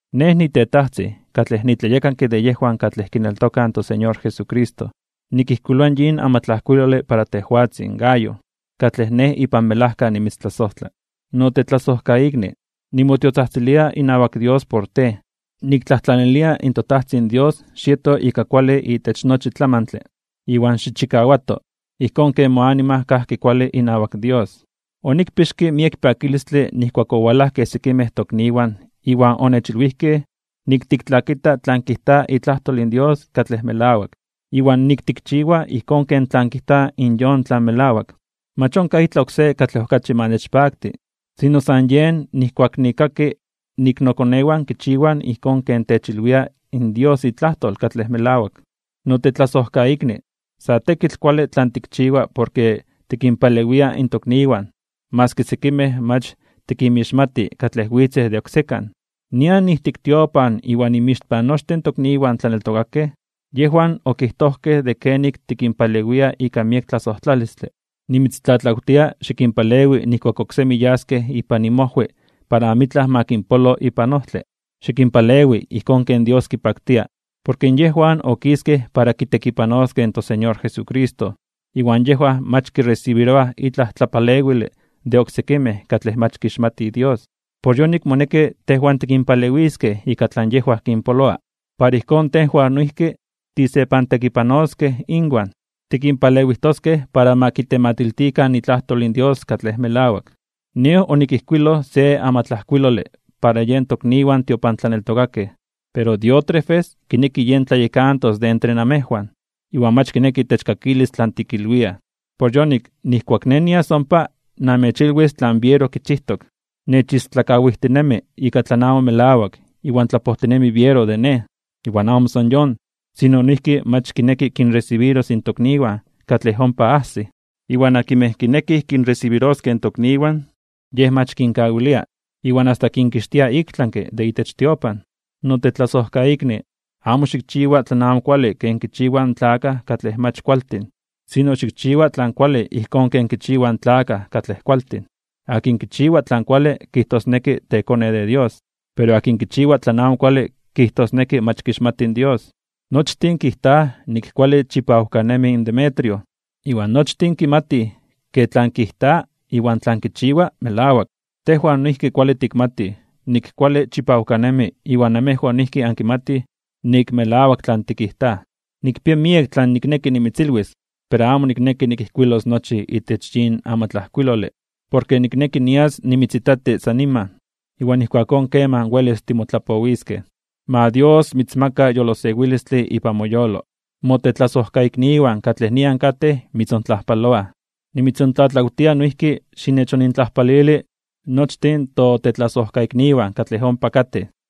Nej, nitetajtzin, katlej nitlayekanke de yejwan katlej kineltokaj in toSeñor Jesucristo, nikijkuiloa yin amatlajkuilole para tejwatzin, Gayo, katlej nej ipan melajka nimitztlasojtla. Notetlasojkaikni, nimotiotzajtzilia inawak Dios por tej. Niktlajtlanilia in toTajtzin Dios xieto ika kuale itech nochi tlamantle, iwan xichikawato, ijkón ken moanima kajki kuale inawak Dios. Onikpixke miek pakilistle nijkuak owalajkej sekimej tokniwan iwan onechilwijkej nik tiktlakita tlan kijta itlajtol in Dios katlej melawak, iwan nik tikchiwa ijkón ken tlan kijta yon tlan melawak. Mach onkaj itlaj oksé katlej okachi ma nechpakti, sino san yen nijkuak nikkaki nik nokonewan kichiwaj ijkón ken techilwia in Dios itlajtol katlej melawak. Notetlasojkaikni, sa tekitl kuale tlan tikchiwa porke tikinpalewia in tokniwan maski sekimej mach tikinmixmati katlej witzej de oksekan. Nian ijtik tiopan iwan inmixpan nochtin tokniwan tlaneltokakej, yejwan okijtojkej de kenik tikinpalewia ika miek tlasojtlalistle. Nimitztlatlawtia, xikinpalewi nijkuak oksemi yaskej ipan inmojwi para amitlaj ma kinpolo ipan ojtle, xikinpalewi ijkón ken Dios kipaktia. Porke yejwan okiskej para kitekipanoskej in toSeñor Jesucristo, iwan yejwan mach kiresibiroaj itlaj tlapalewile de oksekimej katlej mach kixmatij Dios. Por yonik moneki tejwan tikinpalewiskej ika tlan yejwan kinpoloa. Para ijkón tejwan noijki tisepantekipanoskej inwan, tikinpalewijtoskej para ma kitematiltikan itlajtol in Dios katlej melawak. Nej onikijkuiloj se amatlajkuilole para yen tokniwan tiopantlaneltokakej, pero Diótrefes kineki yen tlayekantos de entre namejwan, iwan mach kineki techkakilis tlan tikilwiaj. Por yonik, nijkuak nej nias ompa, namechilwis tlan biero kichijtok. Nechistlakawijtinemi ika tlan amo melawak iwan tlapojtinemi biero de nej. Iwan amo san yon, sino noijki mach kineki kinresibiros in tokniwan katlej ompa ajsij. Iwan akinmej kinekij kinresibiroskej in tokniwan, yej mach kinkawilia, iwan asta kinkixtia iktlanke (ik tlami) de itech tiopan. Notetlasojkaikni, amo xikchiwa tlan amo kuale ken kichiwaj in tlakaj katlej mach kualtin, sino xikchiwa tlan kuale ijkón ken kichiwaj in tlakaj katlej kualtin. Akin kichiwa tlan kuale kijtosneki tekone de Dios, pero akin kichiwa tlan amo kuale kijtosneki mach kixmati in Dios. Nochtin kijtaj nik kuale chipawkanemi in Demetrio, iwan nochtin kimatij ke tlan kijta iwan tlan kichiwa melawak. Tejwan noijki kuale tikmatij nik kuale chipawkanemi iwan namejwan noijki ankimatij nik melawak tlan tikijtaj. Nikpia miek tlan nikneki nimitzilwis, pero amo nikneki nikijkuilos nochi itech yin amatlajkuilole. Porke nikneki nias nimitzitati san niman, iwan ijkuakón kemaj welis timotlapowiskej. Ma Dios mitzmaka yolosewilistle ipan moyolo. Motetlasojkaikniwan katlej nian katej mitzontlajpaloaj. Nimitzontlatlawtia noijki xinechonintlajpalili nochtin totetlasojkaikniwan katlej ompa katej.